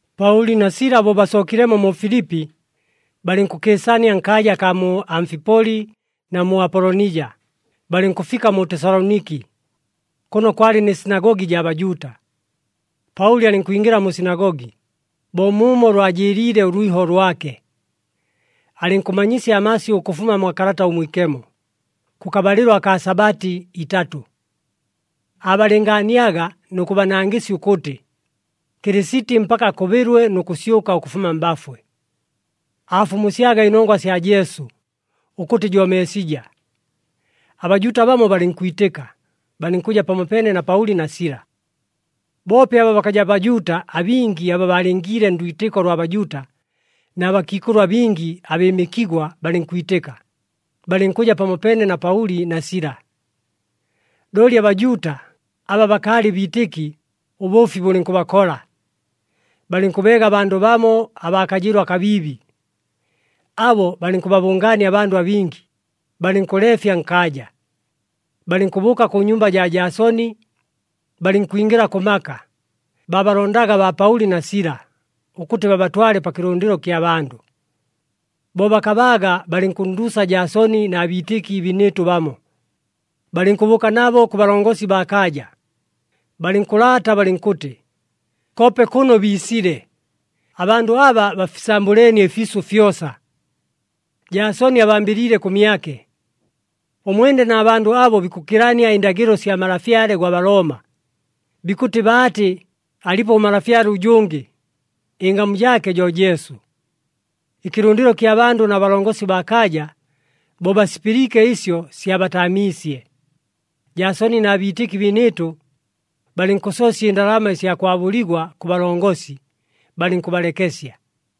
Paʉli na Sila bo basookilemo mu Filipi, balɨnkʉkɨɨsania nkaaja akaa mu Amfipoli na mu Apolonija, balɨnkʉfika mu Tesaloniki. Kʉno kwalɨ nɨ sinagogi jaa Bajuuta. Paʉli alɨnkwingɨla mu sinagogi, bo muumo lwajɨɨliile ʉlwiho lwake. Alɨnkʉmanyisya amasyʉ ʉkʉfuma mwa Kalata ʉMwikemo, kʉkabalɨlo akaa Sabati itatʉ. Aabalɨngaaniaga nʉ kʉbanangɨsya ʉkʉtɨ, Kɨlɨsiti mpaka akʉbɨlwe nʉ kʉsyʉka ʉkʉfuma mbafwe. Aafumusyaga ɨnongwa sya Jesu, ʉkʉtɨ jo Meesija. ABajuuta bamo balɨnkwitɨka, balɨnkʉja pamopeene na Paʉli na Sila. Boope aba bakaja Bajuuta abingi aba baalingiile ndwitɨko lwa Bajuuta na bakiikʉlʉ abingi abɨɨmɨkigwa balɨnkwitɨka, balɨnkʉja pamopeene na Paʉli na Sila. Looli aBajuuta aba bakaalɨ biitɨki ʉbʉʉfi bʉlɨnkʉbakola, balɨnkʉbeega abandʉ bamo abaa kajɨɨlo akabiibi. Abo balɨnkʉbabʉngaania abandʉ abingi, balɨnkʉleefya nkaaja. Balɨnkʉbʉʉka kʉ nyumba jaa Jaasoni, balɨnkwingɨla kʉ maka, baabalondaga baa Paʉli na Sila, ʉkʉtɨ babatwale pa kɨlʉndɨlo kya bandʉ. Bo bakabaaga, balɨnkʉnnduusa Jaasoni na biitɨki biinɨɨtʉ bamo, balɨnkʉbʉʉka nabo kʉ balongosi baa kaaja, balɨnkʉlaata balɨnkʉtɨ, “Koope kʉno biisile, abandʉ aba bafisambʉleenie ɨfiisʉ fyosa. Jaasoni abambɨliile kʉmyake. Ʉmwene na bandʉ abo bikʉkilania ɨndagɨlo sya malafyale gwa Balooma, bikʉtɨ baatɨ alipo ʉmalafyale ʉjʉngɨ, ɨngamu jaake jo Jesu.” Ɨkɨlʉndɨlo kya bandʉ na balongosi baa kaaja bo basipɨliike ɨsyo, syabataamiisye. Jaasoni na biitɨki biinɨɨtʉ balɨnkʉsoosya ɨndalama ɨsya kwabʉligwa kʉ balongosi, balɨnkʉbalekesya.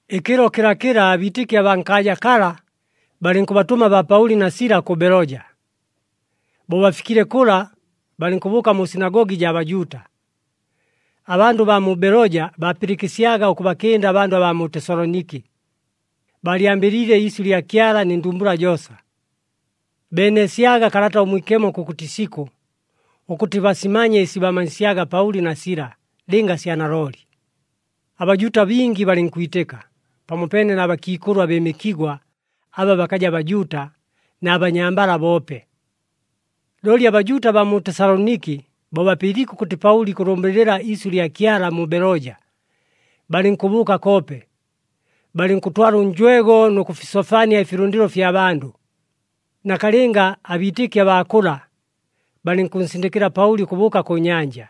Ɨkɨlo kɨlakɨla abiitɨki abaa nkaaja kala, balɨnkʉbatʉma baa Paʉli na Sila kʉ Beloja. Bo bafikile kʉla, balɨnkʉbʉʉka mu sinagogi jaa Bajuuta. Abandʉ baa mu Beloja baapɨlɨkɨsyaga ʉkʉbakɨnda abandʉ baa mu Tesaloniki, baalyambɨliile iisyʉ lya Kyala nɨ ndumbula joosa. Beeneesyaga Kalata ʉMwikemo kʉkʉtɨ isikʉ, ʉkʉtɨ basimanye ɨsi baamanyisyaga Paʉli na Sila lɨnga sya nalooli. ABajuuta bingi balɨnkwitɨka, pamopeene na bakiikʉlʉ abɨɨmɨkigwa aba bakaja Bajuuta, na banyambala boope. Looli aBajuuta abaa mu Tesaloniki, bo bapɨliike ʉkʉtɨ Paʉli ikʉlʉmbɨlɨla iisyʉ lya Kyala mu Beloja, balɨnkʉbʉʉka koope, balɨnkʉtwala ʉnjwego nʉ kʉfisofania ɨfilʉndɨlo fya bandʉ. Nakalɨnga abiitɨki abaa kʉla, balɨnkʉnsindɨkɨla Paʉli ʉkʉbʉʉka kʉ nyanja,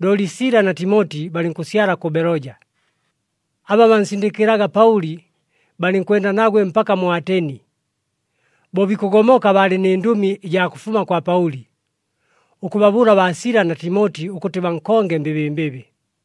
looli Sila na Timoti balɨnkʉsyala kʉ Beloja. Aba bansindɨkɨlaga Paʉli balɨnkwenda nagwe mpaka mu Ateni. Bo bikʉgomoka baalɨ nɨ ndʉmi ɨjaa kʉfuma kwa Paʉli, ʉkʉbabʉʉla baa Sila na Timoti ʉkʉtɨ bankonge mbɨbɨmbɨbɨ.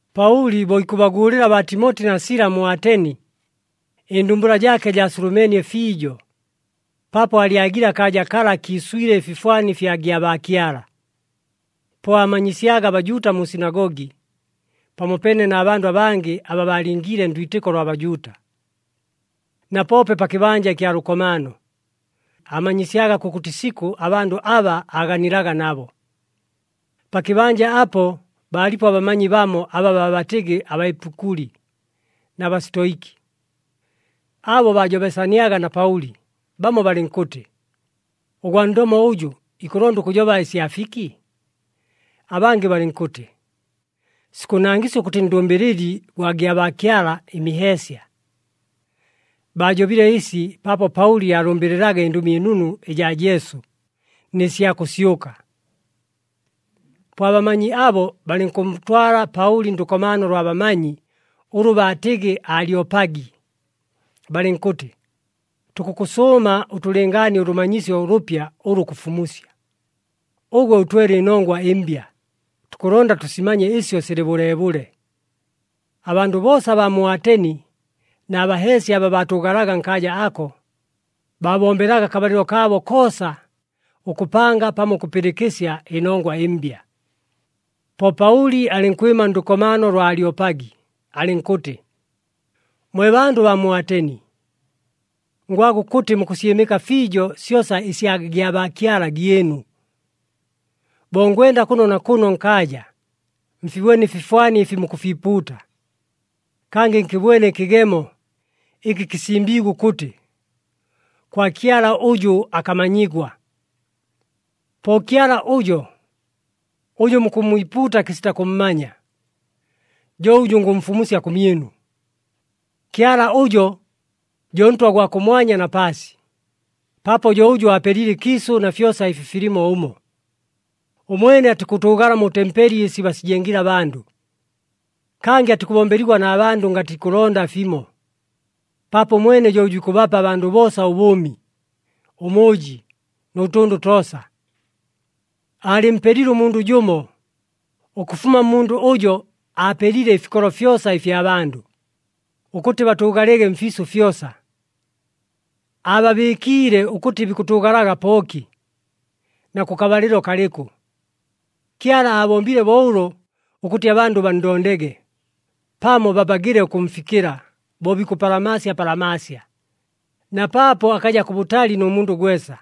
Paʉli bo ikʉbaguulɨla baa Timoti na Sila mu Ateni, ɨndumbula jaake jaasulumeenie fiijo paapo aalyagile akaaja kala kiiswile ɨfifwani ɨfya gyabaakyala. Po aamanyisyaga aBajuuta mu sinagogi, pamopeene na bandʉ abangɨ aba baalingiile ndwitɨko lwa Bajuuta. Na poope pa kɨbanja ɨkya lʉkomaano, aamanyisyaga kʉkʉtɨ isikʉ abandʉ aba aaganilaga nabo. Pa kɨbanja apo, baalipo abamanyi bamo aba baabatɨgɨ, aBaepikuli na Basitoiki. Abo baajobesaniaga na Paʉli, bamo balɨnkʉtɨ, “Ʉgwa ndomo ʉjʉ ikʉlonda ʉkʉjoba ɨsya fiki?” Abangɨ balɨnkʉtɨ, “Sikʉnangɨsya ʉkʉtɨ ndʉmbɨlɨli gwa gyabaakyala ɨmiheesya.” Baajobile ɨsi paapo Paʉli aalʉmbɨlɨlaga ɨNdʉmi ɨNunu ɨjaa Jesu, nɨ sya kʉsyʉka. Po abamanyi abo balɨnkʉntwala Paʉli ndʉkomaano lwa bamanyi ʉlʉ baatɨgɨ Alyopagi, balɨnkʉtɨ, “Tukʉkʉsʉʉma ʉtʉlɨngaanie ʉlʉmanyisyo ʉlʉpya ʉlʉ kʉfumusya. Ʉgwe ʉtwele ɨnongwa ɨmbya, tukʉlonda tʉsimanye ɨsyo silɨ bʉleebʉle.” Abandʉ boosa abaa mu Ateni na baheesya aba baatʉʉgalaga nkaaja ako, baabombelaga akabalɨlo kaabo koosa ʉkʉpanga pamo ʉkʉpɨlɨkɨsya ɨnongwa ɨmbya. Po Paʉli alɨnkwɨma ndʉkomaano lwa Alyopagi, alɨnkʉtɨ, “Mwe bandʉ baa mu Ateni! Ngwaga ʉkʉtɨ mukʉsyɨmɨka fiijo syosa ɨsya gyabaakyala gyɨnu. Bo ngwenda kʉno na kʉno nkaaja, mfibwene ɨfifwani ɨfi mukʉfiipuuta. Kangɨ nkɨbwene ɨkɨgemo ɨkɨ kɨsimbiigwe ʉkʉtɨ, ‘kwa Kyala ʉjʉ akamanyigwa.’ Po Kyala ʉjo, ʉjʉ mukʉmmwipuuta kɨsita kʉmmanya, jo ʉjʉ ngʉmfumusya kʉmyɨnu. “Kyala ʉjo jo Ntwa gwa kʉmwanya na paasi, paapo jo ʉjʉ aapelile ɨkiisʉ na fyosa ɨfi filimo ʉmo. Ʉmwene atikʉtʉʉgala mu tempeli ɨsi basijengile abandʉ. Kangɨ atikʉbombeligwa na bandʉ ngatɨ ikʉlonda fimo, paapo ʉmwene jo ʉjʉ ikʉbapa abandʉ boosa ʉbʉʉmi, ʉmʉʉji nʉ tʉndʉ toosa. Aalɨmpelile ʉmundʉ jʉmo, ʉkʉfuma mmundʉ ʉjo aapelile ɨfikolo fyosa ɨfya bandʉ, ʉkʉtɨ batʉʉgalege mfiisʉ fyosa. Aababɨɨkiile ʉkʉtɨ bikʉtʉʉgalaga pooki, na kʉkabalɨlo kalɨkʉ. Kyala aabombile bo ʉlo, ʉkʉtɨ abandʉ banndondege, pamo babagiile ʉkʉmfikɨla bo bikʉpalamaasya palamaasya, na paapo akaja kʉbʉtali nʉ mundʉ gwesa.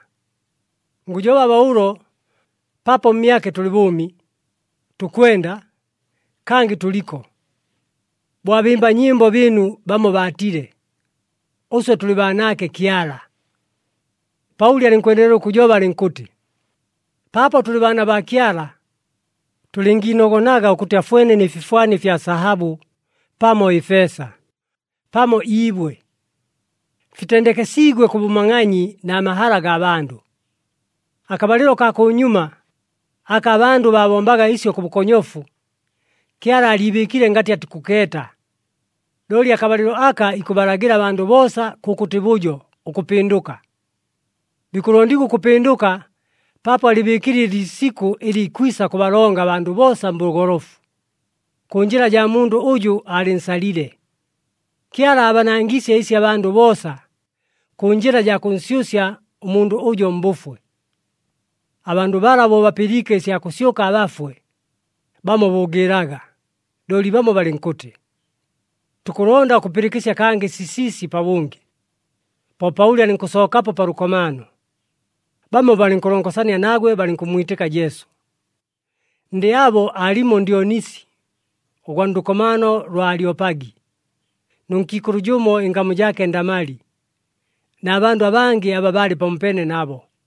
Ngʉjoba bo ʉlo, ‘Paapo mmyake tʉlɨ bʉʉmi, tukwenda, kangɨ tʉliko.’ Bo abɨmba nyɨmbo bɨɨnu bamo baatile, ‘Ʉswe tʉlɨ baanaake Kyala.’” Paʉli alɨnkwendelela ʉkʉjoba, alɨnkʉtɨ, “Paapo tʉlɨ baana baa Kyala, tʉlɨngiinogonaga ʉkʉtɨ afwene nɨ fifwani ɨfya sahabʉ pamo ɨfeesa, pamo iibwe. Fitendekesiigwe kʉ bʉmangʼanyi na mahala gaa bandʉ. Akabalɨlo kaa kʉnyuma, aka abandʉ baabombaga ɨsyo kʉ bʉkonyofu, Kyala aaliibɨɨkile ngatɨ atikʉkeeta. Looli akabalɨlo aka ikʉbalagɨla abandʉ boosa kʉkʉtɨ bʉjo, ʉkʉpɨndʉka. Bikʉlondigwa ʉkʉpɨndʉka paapo alɨbɨɨkile ɨliisikʉ ɨlɨ ikwisa kʉbalonga abandʉ boosa mbʉgolofu, kʉ njɨla jaa mundʉ ʉjʉ aalɨnsalile. Kyala aabanangiisye ɨsi abandʉ boosa, kʉ njɨla jaa kʉnsyʉsya ʉmundʉ ʉjo mbʉfwe.” Abandʉ bala bo bapɨliike ɨsya kʉsyʉka abafwe, bamo bʉʉgɨɨlaga, looli bamo balɨnkʉtɨ, “Tukʉlonda ʉkʉpɨlɨkɨsya kangɨ sisiisi pabʉngɨ.” Po Paʉli alɨnkʉsookapo pa lʉkomaano. Bamo balɨnkʉlongosania nagwe, balɨnkʉmmwitɨka Jesu. Ndɨ abo aalimo Ndyonisi, ʉgwa ndʉkomaano lwa Alyopagi, nʉ nkiikʉlʉ jʉmo ɨngamu jaake Ndamali, na bandʉ abangɨ aba baalɨ pamopeene nabo.